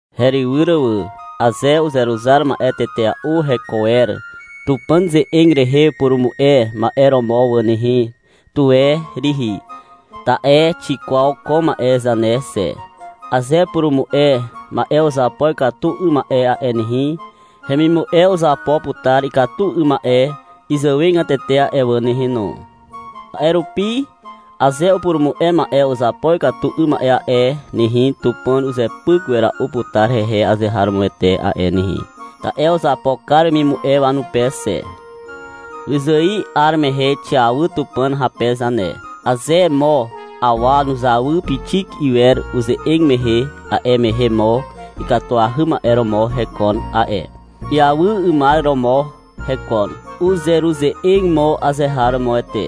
Herywyr wà. Aze uzeruzar ma'e tetea'u heko wer Tupàn ze'eg rehe upurumu'e ma'e romo wà nehe, tuwe rihi. Ta'e xikwaw ko ma'e zane xe. Aze upurumu'e ma'e uzapo ikatu 'ym ma'e a'e nehe, hemimu'e uzapo putar ikatu 'ym ma'e izàwegatete a'e wà nehe no. A'e rupi aze upurumu'e ma'e uzapo ikatu 'ym ma'e a'e nehe, Tupàn uzepyk wera'u putar hehe azeharomoete a'e nehe. (Ta'e uzapo kar wemimu'e wanupe xe.) Wyzài 'ar mehe xiawy Tupàn hape zane. Aze mo awa nuzawy pixik iwer uze'eg mehe, a'e mehe mo ikatuahy ma'e romo mo hekon a'e. Iawy 'ymar romo mo hekon. Uzeruze'eg mo azeharomoete.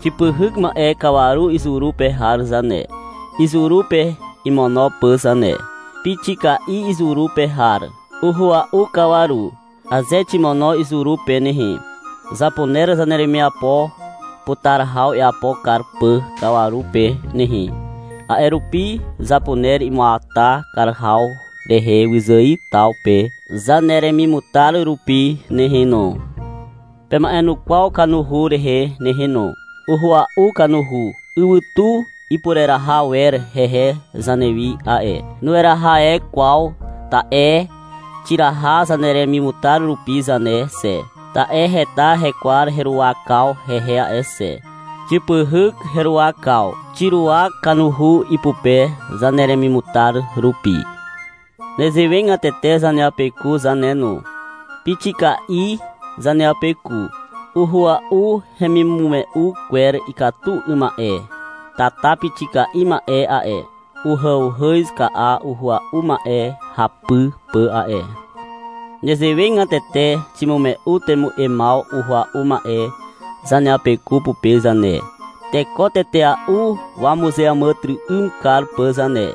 Xipyhyk ma'e kawaru izuru pe har zane, izuru pe imono pà zane. Pixika'i izuru pe har. Uhua'u kawaru. Aze ximono izuru pe nehe, zapuner zaneremiapo putar haw iapo kar pà kawaru pe nehe. A'e rupi zapuner imuata kar haw rehe wyzài taw pe zaneremimutar rupi nehe no. Pema'enukwaw kanuhu rehe nehe no. Uhua'u kanuhu. Ywytu ipureraha wer hehe zanewi a'e. Nueraha e kwaw, ta'e xiraha zaneremimutar rupi zane xe, ta'e heta hekwar heruwakaw hehe a'e xe. Xipyhyk heruwakaw. Xiruwak kanuhu ipupe zaneremimutar rupi. Nezewegatete zaneapeku zane no. Pixika'i zaneapeku. Uhua'u hemimume'u kwer ikatu 'ym ma'e. Tata pixika'i ma'e a'e, uhàuhàz ka'a uhua'u ma'e hapy pà a'e. Nezewegatete ximume'u temu'emaw uhua'u ma'e zaneapeku pupe zane, teko tetea'u wamuzeàmàtyry'ym kar pà zane.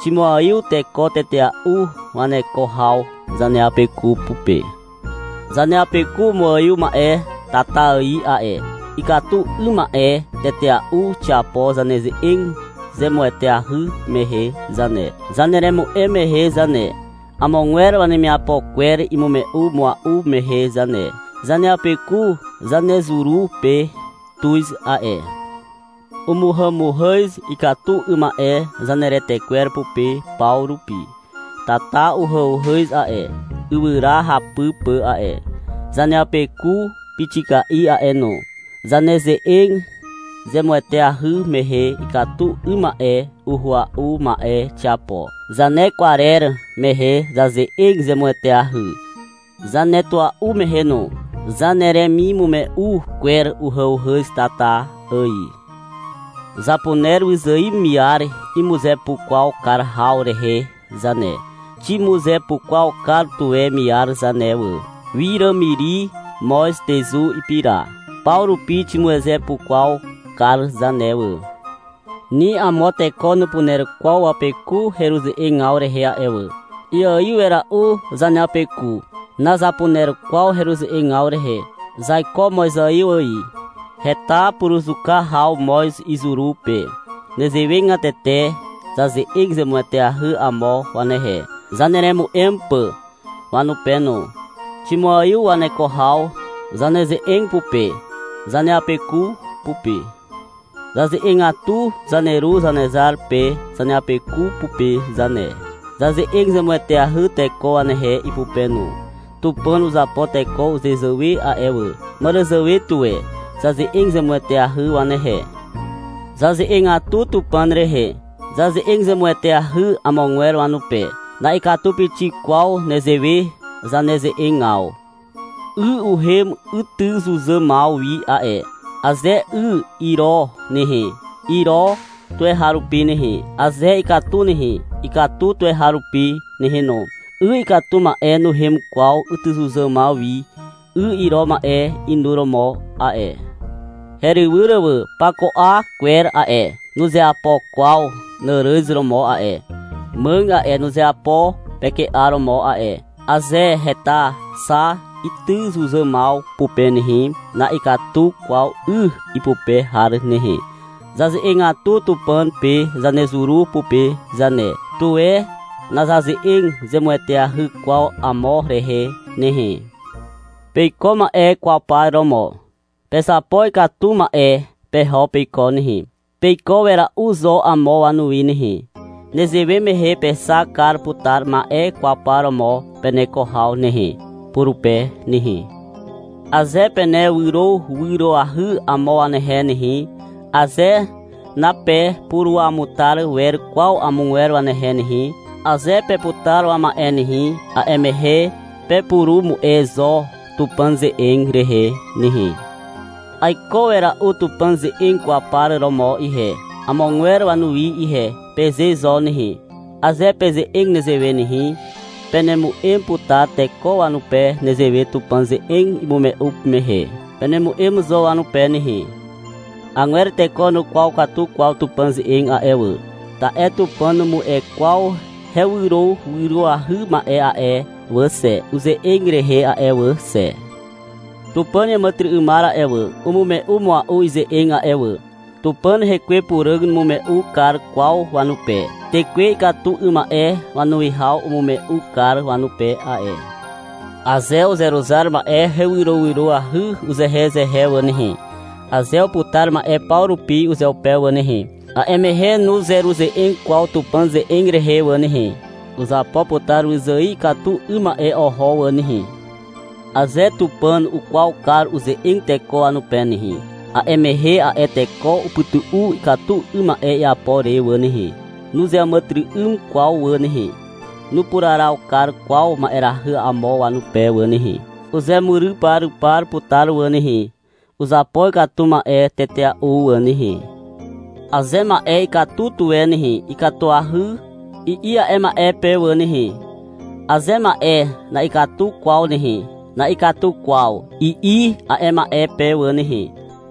Ximuaiw teko tetea'u waneko haw zaneapeku pupe. Zaneapeku umuaiw ma'e tata ài a'e. Ikatu 'ym ma'e tetea'u xiapo zaneze'eg zemueteahy mehe zane, zaneremu'em mehe zane, amogwer wanemiapo kwer imume'u mua'u mehe zane. Zaneapeku zanezuru pe tuz a'e. Umuhàmuhàz ikatu 'ym ma'e zaneretekwer pupe paw rupi. Tata uhàuhàz a'e, ywyra hapy pà a'e. Zaneapeku pixika'i a'e no. Zaneze'eg zemueteahy mehe, ikatu 'ym ma'e uhua'u ma'e xiapo. Zanekwarer mehe zaze'eg zemueteahy. Zanetua'u mehe no. Zaneremimume'u kwer uhàuhàz tata ài. Zapuner wyzài miar imuzepukwaw kar haw rehe zane. Ximuzepukwaw kar tuwe miar zane wà. Wiràmiri, moz, tezu, ipira. Paw rupi ximuzepukwaw kar zane wà. Ni amo teko nupuner kwaw wapeku heruze'egaw rehe a'e wà. Iaiw wera'u zaneapeku. Nazapuner kwaw heruze'egaw rehe. Zaiko mozaiw ài. Heta puruzuka haw moz izuru pe. Nezewegatete zaze'eg zemueteahy amo wanehe, zaneremu'em pà wanupe no. Ximuaiw waneko haw zaneze'eg pupe zaneapeku pupe. Zaze'egatu Zaneru Zanezar pe zaneapeku pupe zane. Zaze'eg zemueteahy teko wanehe ipupe no. Tupàn uzapo teko uzezàwe a'e wà. Màràzàwe tuwe zaze'eg zemueteahy wanehe. Zaze'egatu Tupàn rehe. Zaze'eg zemueteahy amogwer wanupe. Na'ikatu pixik kwaw nezewe zaneze'egaw. 'Y uhem ytyzuzàmaw wi a'e. Aze 'y iro nehe, iro tuweharupi nehe. Aze ikatu nehe, ikatu tuweharupi nehe no. 'Y ikatu ma'e nuhem kwaw ytyzuzàmaw wi 'y iro ma'e inuromo a'e. Herywyr wà. Pako 'a kwer a'e, nuzeapo kwaw nàràz romo a'e. Màg a'e, nuzeapo peke'a romo a'e. Aze heta xa ytyzuzàmaw pupe nehe, na'ikatu kwaw 'y ipupe har nehe. Zaze'egatu Tupàn pe zanezuru pupe zane. Tuwe nazaze'eg zemueteahy kwaw amo rehe nehe. Peiko ma'e kwaw par romo. Pezapo ikatu ma'e peho peiko nehe. Peiko wera'u zo amo wanuwi nehe. Nezewe mehe pexak kar putar ma'e kwaw par romo peneko haw nehe, purupe nehe. Aze penewyrowyroahy amo wanehe nehe, aze napepuruamutar wer kwaw amogwer wanehe nehe, aze peputar wama'e nehe, a'e mehe pepurumu'e zo Tupàn ze'eg rehe nehe. — Aiko wera'u Tupàn ze'eg kwaw par romo ihe, amogwer wanuwi ihe, peze zo nehe. Aze peze'eg nezewe nehe, penemu'em putar teko wanupe nezewe Tupàn ze'eg imume'u mehe. Penemu'em zo wanupe nehe. Agwer teko nukwaw katu kwaw Tupàn ze'eg a'e wà, ta'e Tupàn numu'e kwaw hewyrowyroahy ma'e a'e wà xe, uze'eg rehe a'e wà xe. Tupàn iàmàtyry'ymar a'e wà, umume'u mua'u ize'eg a'e wà. Tupàn Hekwe Puràg numume'u kar kwaw wanupe. Tekwe ikatu 'ym ma'e wanuwihaw umume'u kar wanupe a'e. Aze uzeruzar ma'e hewyrowyroahy uzehezehe wà nehe, aze uputar ma'e paw rupi uzeupe wà nehe, a'e mehe nuzeruze'eg kwaw Tupàn ze'eg rehe wà nehe. Uzapo putar wyzài ikatu 'ym ma'e oho wà nehe. Aze Tupàn ukwaw kar uze'eg teko wanupe nehe, a'e mehe a'e teko upytu'u ikatu 'ym ma'e iapo re wà nehe. Nuzeàmàtyry'ym kwaw wà nehe. Nupuraraw kar kwaw ma'erahy amo wanupe wà nehe. Uzemuryparypar putar wà nehe. Uzapo ikatu ma'e tetea'u wà nehe. Aze ma'e ikatu tuwe nehe, — Ikatuahy, i'i a'e ma'e pe wà nehe. Aze ma'e na'ikatu kwaw nehe, — Na'ikatu kwaw, i'i a'e ma'e pe wà nehe.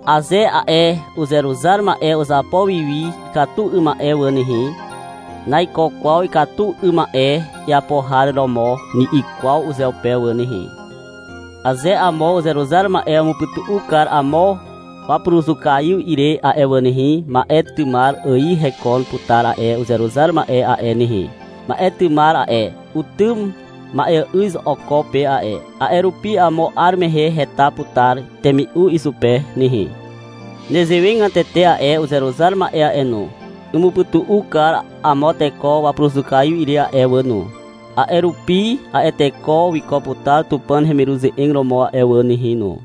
Aze a'e uzeruzar ma'e uzapo wiwi ikatu 'ym ma'e wà nehe, — Naiko kwaw ikatu 'ym ma'e iapo har romo, ni'i kwaw uzeupe wà nehe. Aze amo uzeruzar ma'e umupytu'u kar amo wapuruzukaiw ire a'e wà nehe, ma'e tymar ài hekon putar a'e uzeruzar ma'e a'e nehe. Ma'e tymar a'e, utym ma'eà'yz oko pe a'e. A'e rupi amo 'ar mehe heta putar temi'u izupe nehe. Nezewegatete a'e uzeruzar ma'e a'e no, umupytu'u kar amo teko wapuruzukaiw ire a'e wà no. A'e rupi a'e teko wiko putar Tupàn hemiruze'eg romo a'e wà nehe no.